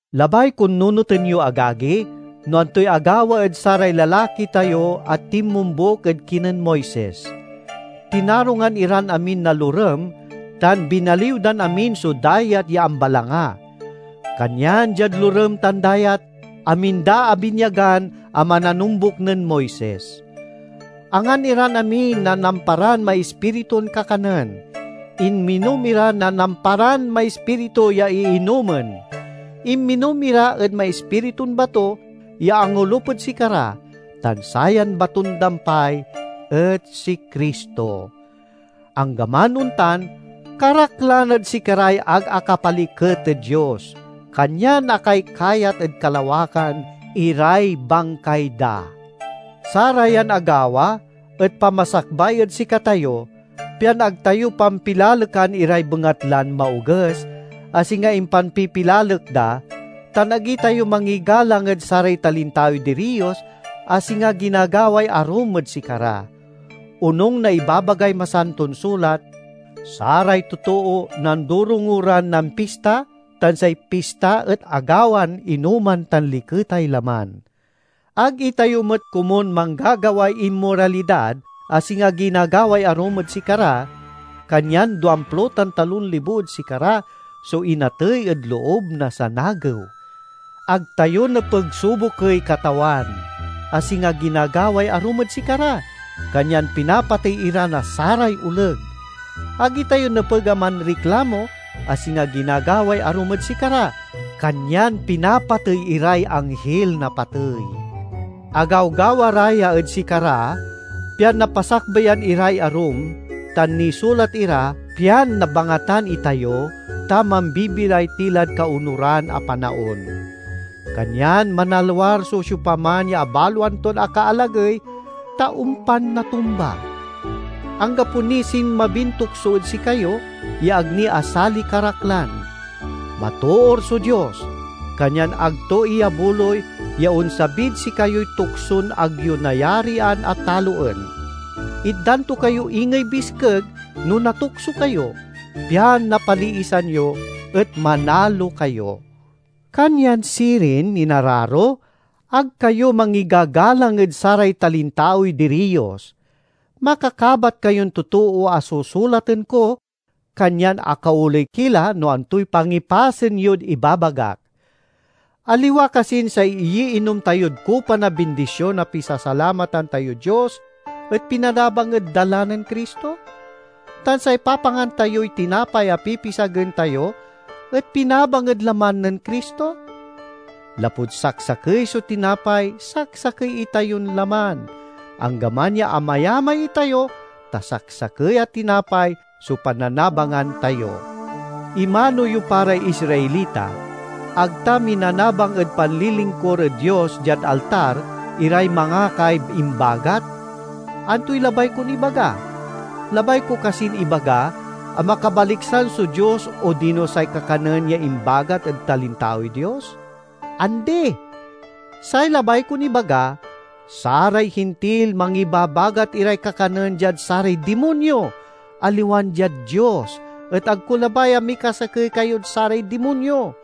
Labay kon nunoten yo, agagi, no antoy agawa ed saray lalaki tayo a tinmombuk ed kinen Moises. Tinarungan iran amin na lorem tan binaliw dan amin so Dayat ya Ambalanga. Kanyan diad lorem tan dayat, amin da abinyagan a mananombuk nen Moises. Angan iran amin na namparan maispiritun kakanen, inminom ira na namparan maispiritu ya iinomen. Inminom ira ed maispiritun bato ya angolup ed sikara, tan sayan baton-dampay et si Cristo. Anggaman ontan, karaklan ed sikaray ag akapaliket ed Dios, kanyan akaykayat ed kalawakan iray bangkay da. Sarayan agawa et pamasakbay ed sikatayo, pian ag tayo pampilalekan iray bengatlan maoges, a singa impanpipilalek da, tan ag itayo mangigalang ed saray talintaoy diriyos, a singa ginagaway arum ed sikara. Onung na ibabagay Masanton Sulat, "Saray totoo nandorongo ran nampista, tan say pista et agawan inoman tan liketay laman." Ag itayo met komun manggagaway inmoralidad, a singa ginagaway arum ed sikara, kanyan duamplo tan talon libo ed sikara so inatey ed loob na sanagew. Ag tayo nepeg subokey Katawan, a singa ginagaway arum ed sikara, kanyan pinapatey ira na saray oleg. Ag itayo nepeg a manriklamo, a singa ginagaway arum ed sikara, kanyan pinapatey iray Anghil na Patey. Agawgawa ra ya ed sikara pian napasakbayan iray arum, tan nisulat ira pian nabangatan itayo, ta mambibilay ti lad kaonuran a panaon. Kanyan manalwar so siopaman ya abaloan ton akaalagey, ta ompan natumba. Anggapo niy sinmabin tukso ed sikayo ya ag ni asaliy karaklan. Matoor so Dios, kanyan ag to iyabuloy ya onsabid sikayoy tukson ag yo nayarian a taloen. Itdan to kayo ingey biskeg no natukso kayo, pian napaliisan yo, et manalo kayo. Kanyan sirin, inararo, ag kayo mangigagalang ed saray talintaoy diriyos. Makakabat kayon totoo a susulaten ko, kanyan akaoley ki la no antoy pangipasen yod ibabagak. Aliwa kasin say iyiinom tayod kupa na bindision a pisasalamatan tayod Dios et pinanabang ed dala nen Cristo? Tan say papangan tayoy tinapay a pipisagen tayo et pinabang ed laman nen Cristo? Lapud saksakey so tinapay saksakey itayon laman, anggaman ya amayamay itayo, ta saksakey a tinapay so pannanabangan tayo. Imano yo pa ray Israelita: ag ta minanabang ed panlilingkur ed Dios diad altar iray mangakay imbagat? Antoy labay kon ibaga? Labay ko kasin ibaga a makabaliksan so dios odino say kakanen ya imbagat ed talintaoy dios? Andi! Say labay kon ibaga: saray Hintil mangibabagat iray kakanen diad saray dimonyo, aliwan diad Dios, et ag ko labay a mikasakey kayod saray dimonyo.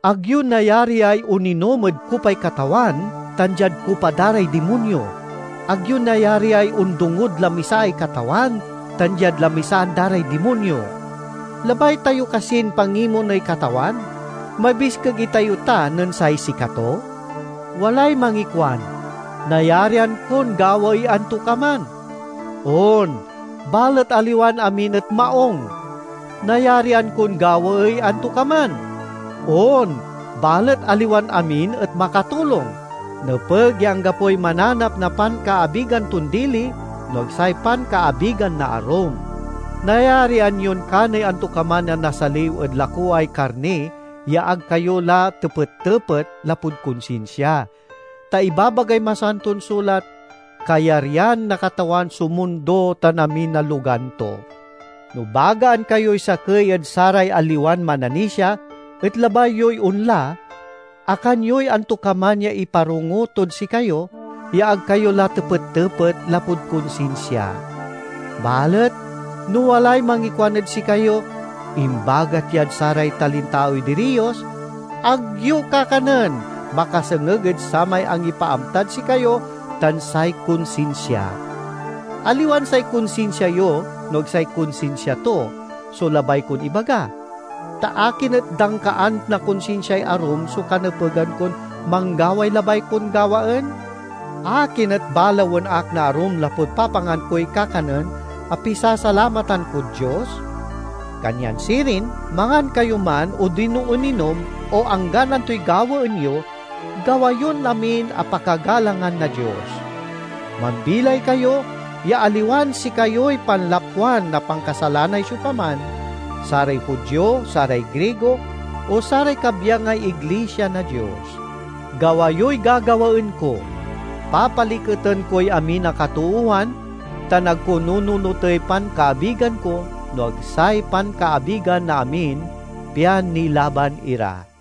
Ag yo nayariay oninom ed kupay Katawan tan diad kupa da ray dimonyo. Ag yo nayariay ondongod lamisaay Katawan tan diad lamisaan da ray dimonyo. Labay tayo kasin pangimoney Katawan? Mabiskeg itayo ta nen say sikato? Walay mangikuan, "Nayarian kon gawaey antokaman." On, balet aliwan amin et maung. "Nayarian kon gawaey antokaman." On, balet aliwan amin et makatulong. Nepeg ya anggapoy mananap na pankaabigan ton dili, no ag say pankaabigan na arum. Nayarian yon kaney antokaman a nasaliw ed lakoway karni ya ag kayo la tepet-tepet, lapud konsinsia. Ta ibabagay Masanton Sulat, "Kayaryan na Katawan so mundo tan amin a logan to." No bagaan kayoy sakey ed saray aliwan mananisia, et labay yoy onla, akan yoy antokaman ya iparongo tod sikayo, ya ag kayo la tepet-tepet, lapud konsinsia. Balet no walay mangikuan ed sikayo, "Imbagat yad saray talintaoy diriyos," ag yo kakanen, makasengeg ed samay angipaamtad sikayo tan say konsinsia; aliwan say konsinsia yo no ag say konsinsia to, so labay kon ibaga. Ta akin et dangkaan na konsinsiay arum so kanepegan kon manggaway labay kon gawaen? Akin et balawen ak na arum lapud papangan koy kakanen a pisasalamatan kod Dios? Kanyan sirin, mangan kayo man odino oninom, o anggan antoy gawaen yo, gawa yon amin a pakagalangan na Dios. Mambilay kayo ya aliwan sikayoy panlapwan na pankasalanay siopaman—saray Judio, saray Grigo, o saray kabyangay iglisia na Dios. Gawa yoy gagawaen ko; papaliketen koy amin a katoowan tan ag ko nununotey pankaabigan ko, no ag say pankaabigan na amin pian nilaban ira.